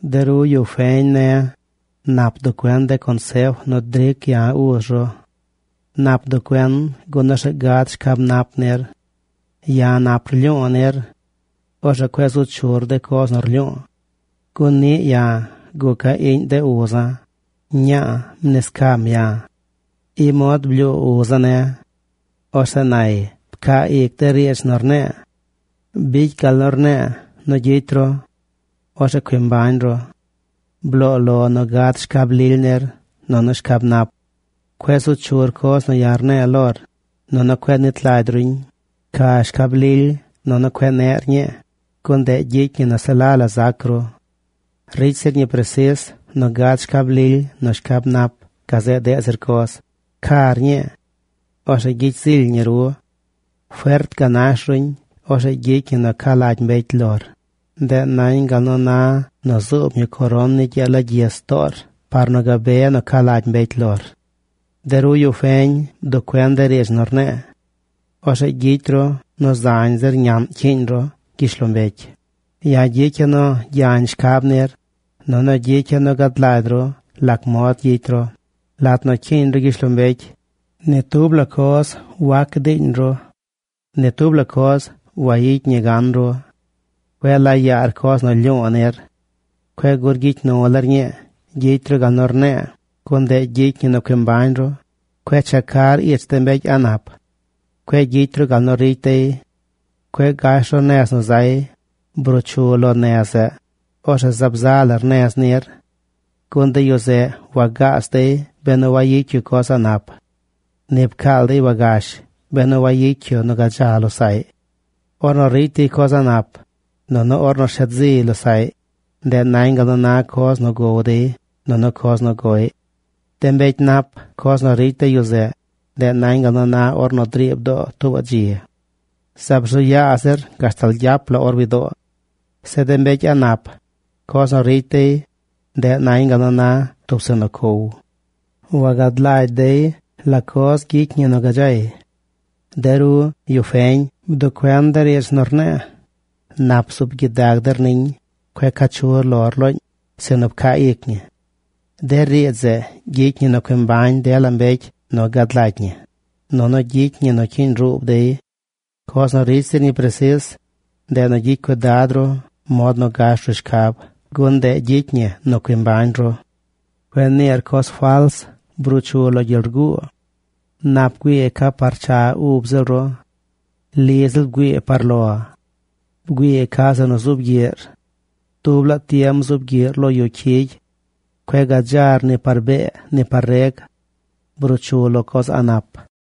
De ru yu feñ ne̱, nap bduꞌ cuen de consef nu dric ya̱, uz ru. Nap bduꞌ cuen, gun orzeꞌ gad shcab nap nir. Ya̱ nap rlyu̱u̱ nir. Orzeꞌ cueꞌ zu chur de coz nu rlyu̱u̱. Gun niꞌ ya̱ guca̱ iꞌñ de uza̱. Ña̱a̱ mniscam ya̱. I mod blyuu uza̱ ne̱. Orzeꞌ nay: “Pcaa ic de riidz nu rne̱e̱. Bicy gal nu rne̱e̱ nu gyicy ru. Orzeꞌ cui mbañ ru. Bloo lo nu gad shcab lily nir nunu shcab nap. Cueꞌ zu chur coz nu ya̱ rne̱e̱ lor, nunu cueꞌ nit lagy ruñ. Pca shcab lily, nunu cueꞌ neꞌr ñii, gun ndeꞌ gyicy ñi nu se la la zac ru. Ricy zir ñi presis nu gad shcab lily nu shcab nap gazeꞌ deꞌ zir coz. Car ñii. Orzeꞌ gyicy zily ñi ru. Fert ganash ruñ. Orzeꞌ gyicy ñi nu ca lagy mbecy lor. Ndeꞌ nañ gal na nu zuub ñi coron ni gyee lagyis toor par nu gabe nu ca lagy mbecy lor.” De ru yu feñ, bduꞌ cuen de riidz nu rne̱e̱. Orzeꞌ gyicy ru nu zañ zir ñaꞌn cyiiñ ru gyishlombecy. Ya̱ gyicya̱ nu gyañ shcab nir, nunu gyicya̱ nu gad lagy ru lac mod gyicy ru. Lat nu cyiiñ ru gyishlombecy, ni tub la coz wac diiñ ru. Ni tub la coz wayicy ñi gan ru. Cueꞌ laa yaar coz nu lyu̱u̱ nir. Cueꞌ gur gyicy nu lar ñii. Gyicy ru gal nu rne̱e̱, gun ndeꞌ gyicy ñi nu cui mbañ ru. Cueꞌ checar ich de mbecy a̱ꞌ nap. Cueꞌ gyicy ru gal nu ricy dey. Cueꞌ gash ru nez nu zay. Bruu chu lo nez zeꞌ. Orzeꞌ zaab za lar nez nir. Gun de yu zeꞌ wagaas dey benu wagyicy yu coz a̱ꞌ nap. Ni pcaal dey wagash benu wayicy yu nu gadza losaꞌy. Ornu ricy dey coz a̱ꞌ nap, nunu ornu shet ziy losaꞌy, ndeꞌ nañ gal nu na coz nu gow dey nunu coz nu goꞌy. De mbecy nap, coz nu ricy de yu zeꞌ, ndeꞌ nañ gal nu na ornu driib doo tuubaꞌ dzi. Zaab rzu yaa zir gashtal gyap la or widoo. Zeꞌ de mbecy a̱ꞌ nap, coz nu ricy dey, ndeꞌ nañ gal nu na tub zeꞌ nu cow. Wagad lagy dey la coz ricy ñi nu gadzay. De ru, yu feñ, bduꞌ cuen de riidz nu rne̱e̱. Nap bzuub gyidag der niñ. Cueꞌ caa chu lor looñ, sinu pcaa ic ñi. De riidz zeꞌ gyicy ñi nu cui mbañ dela mbecy nu gad lagy ñi, nunu gyicy ñi nu cyiiñ ruub dey. Coz nu ricy zir ñi presis, ndeꞌ nu gyicy cuidad ru mod nu gash ru shcab, gun ndeꞌ gyicy ñi nu cui mbañ ru. Cueꞌ niir coz fals. Bruu chu lo gyel guu. Nap bgüii ca par cha ub ziꞌl ru. Li ziꞌl bgüii par lo. Bgüii ca zeꞌ nu zuub gyiꞌr. Dub laa tiem zuub gyiꞌr lo yu cyigy. Cueꞌ gadzar ni par bee, ni par reg. Bruu chu lo coz a̱ꞌ nap.